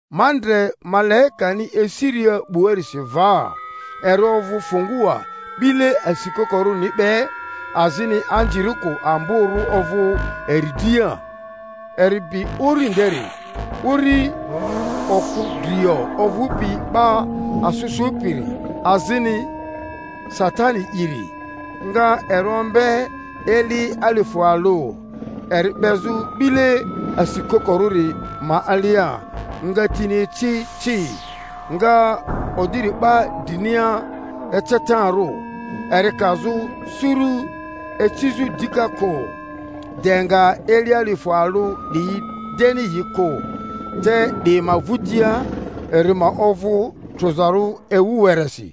Ma ndre malaikani esiria 'buarisi va, eri ovᴜ fungua 'bile asikokorᴜniri be, azini anzirikᴜ amborᴜ ovᴜ eri dria. Eri bi uri nderi, uri oku drio ovᴜpi 'Ba asᴜ Sᴜpiri azini Satani'iri, nga eri ombe eli alifᴜ alᴜ, eri 'bezᴜ 'bile asikokorᴜri ma alia, nga tini eci ci, nga oderi 'ba drinia ecetarᴜ, eri kazᴜ suru icizᴜ dika kᴜ de nga eli alifᴜ alᴜ 'diyi deni yi kᴜ, te 'di ma vᴜtia eri ma ovᴜ trᴜzarᴜ ewu weresi.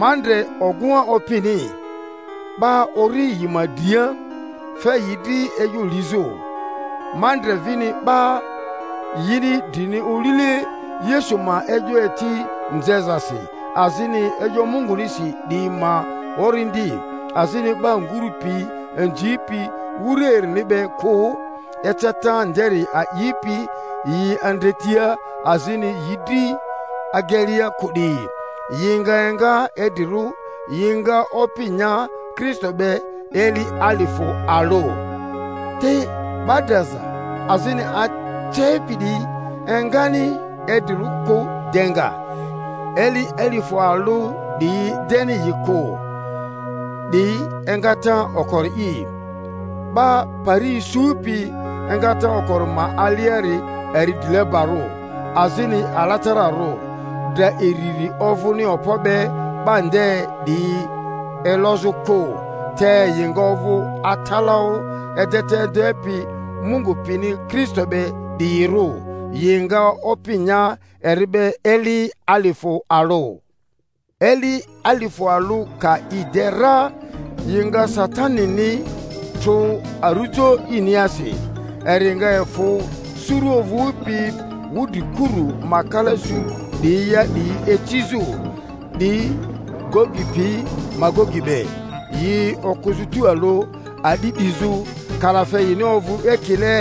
Ma ndre ogᴜŋa opini, 'ba ori yi ma dria, fe yi dri e'yo lizᴜ. Ma ndre vini 'ba yini drini olile Yesu ma e'yo eti nzezasi azini e'yo Mungunisi 'diyi ma orindi, azini 'ba nguru pi inzipi wura erini be kᴜ, eceta nderi a'ipi yi andretia azini yi dri agelea kᴜ 'diyi. Yi nga enga idrirᴜ, yi nga opi nya Kristo be eli alifᴜ alᴜ. Te 'ba draza azini acepi 'diyi engani idrirᴜ kᴜ de nga eli alifᴜ alᴜ 'diyi deni yi kᴜ. 'Di engata okori'i. 'Ba pari isupi engata okori ma aliari eri drilebarᴜ azini alatararᴜ! Dra iriri ovᴜni okpo be 'ba nde 'diyi elozᴜ kᴜ, te yi nga ovᴜ atalaᴜ edeta edepi Mungu pini Kristo be 'diyirᴜ, yi nga opi nya eri be eli alifᴜ alᴜ. Eli alifᴜ alᴜ ka yi de ra yi nga Satanini trᴜ arᴜjo iniasi, eri nga efᴜ suru ovᴜpi wudrikurᴜ ma kala su 'diyia 'diyi icizᴜ, 'di Gogi pi Magogi be, yi okᴜzᴜ tualᴜ a'di 'dizᴜ; kalafe yini ovᴜ ekile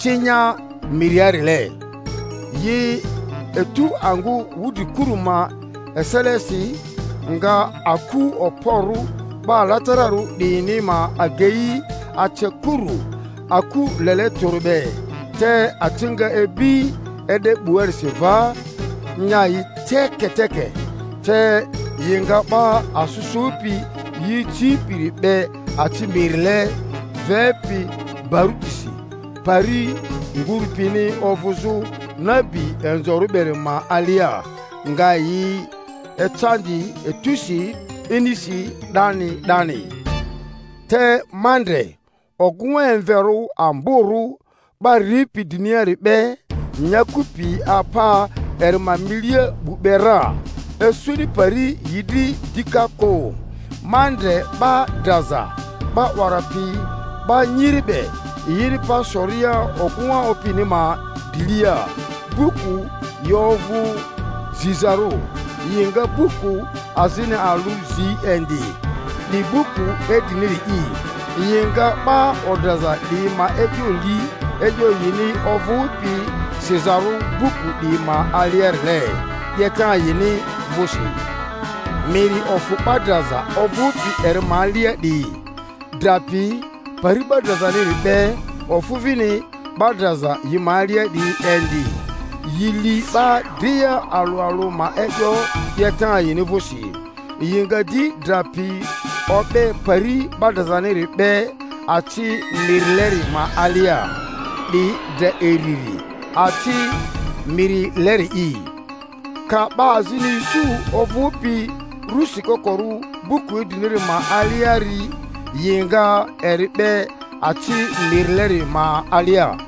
cinya miriarile. Yi etu angᴜ wudrikuru ma eselesi, nga aku okporᴜ 'ba alatararᴜ 'diyini ma agei ace kuru, aku lele tᴜri be; te aci nga ibi e'de 'buarisi va, nya yi teketeke, te yi nga 'Ba asᴜ Sᴜpi yi icipiri 'be aci mirile vepi barutisi, pari ngurᴜ pini ovᴜzᴜ nabi inzorᴜ beri ma alia, nga yi ecandi etusi inisi 'dani 'dani. Te ma ndre ogᴜŋa emverᴜ amborᴜ, 'ba ripi driniari be; nyaku pi apa eri ma milia 'bu be ra, isuni pari yi dri dika kᴜ. Ma ndre 'ba draza, 'ba 'wara piyi 'ba nyiri be, yini pa soria ogᴜŋa opini ma drilia; buku yi ovᴜ zizarᴜ. Yi nga buku azini alᴜ zi indi, 'di buku idriniri'i. Yi nga 'ba odraza 'diyi ma e'yo li e'yo yini ovᴜpi sizaro buku 'diyi ma aliarile, 'yeta yini vᴜsi. Miri ofᴜ 'ba draza ovᴜpi eri ma alia 'diyi, Dra pi Pari 'ba drazaniri be ofᴜ vini 'ba draza yi ma alia 'diyi indi; yi li 'ba dria alᴜ alᴜ ma e'yo 'yeta yini vᴜsi. Yi nga di Dra pi o'be Pari 'ba drazaniri be aci mirileri ma alia. 'Di dra iriri, aci mirileri'i; ka 'ba azini isu ovᴜpi ru sikokorᴜ buku idriniri ma aliari, yi nga eri 'be aci mirileri ma alia.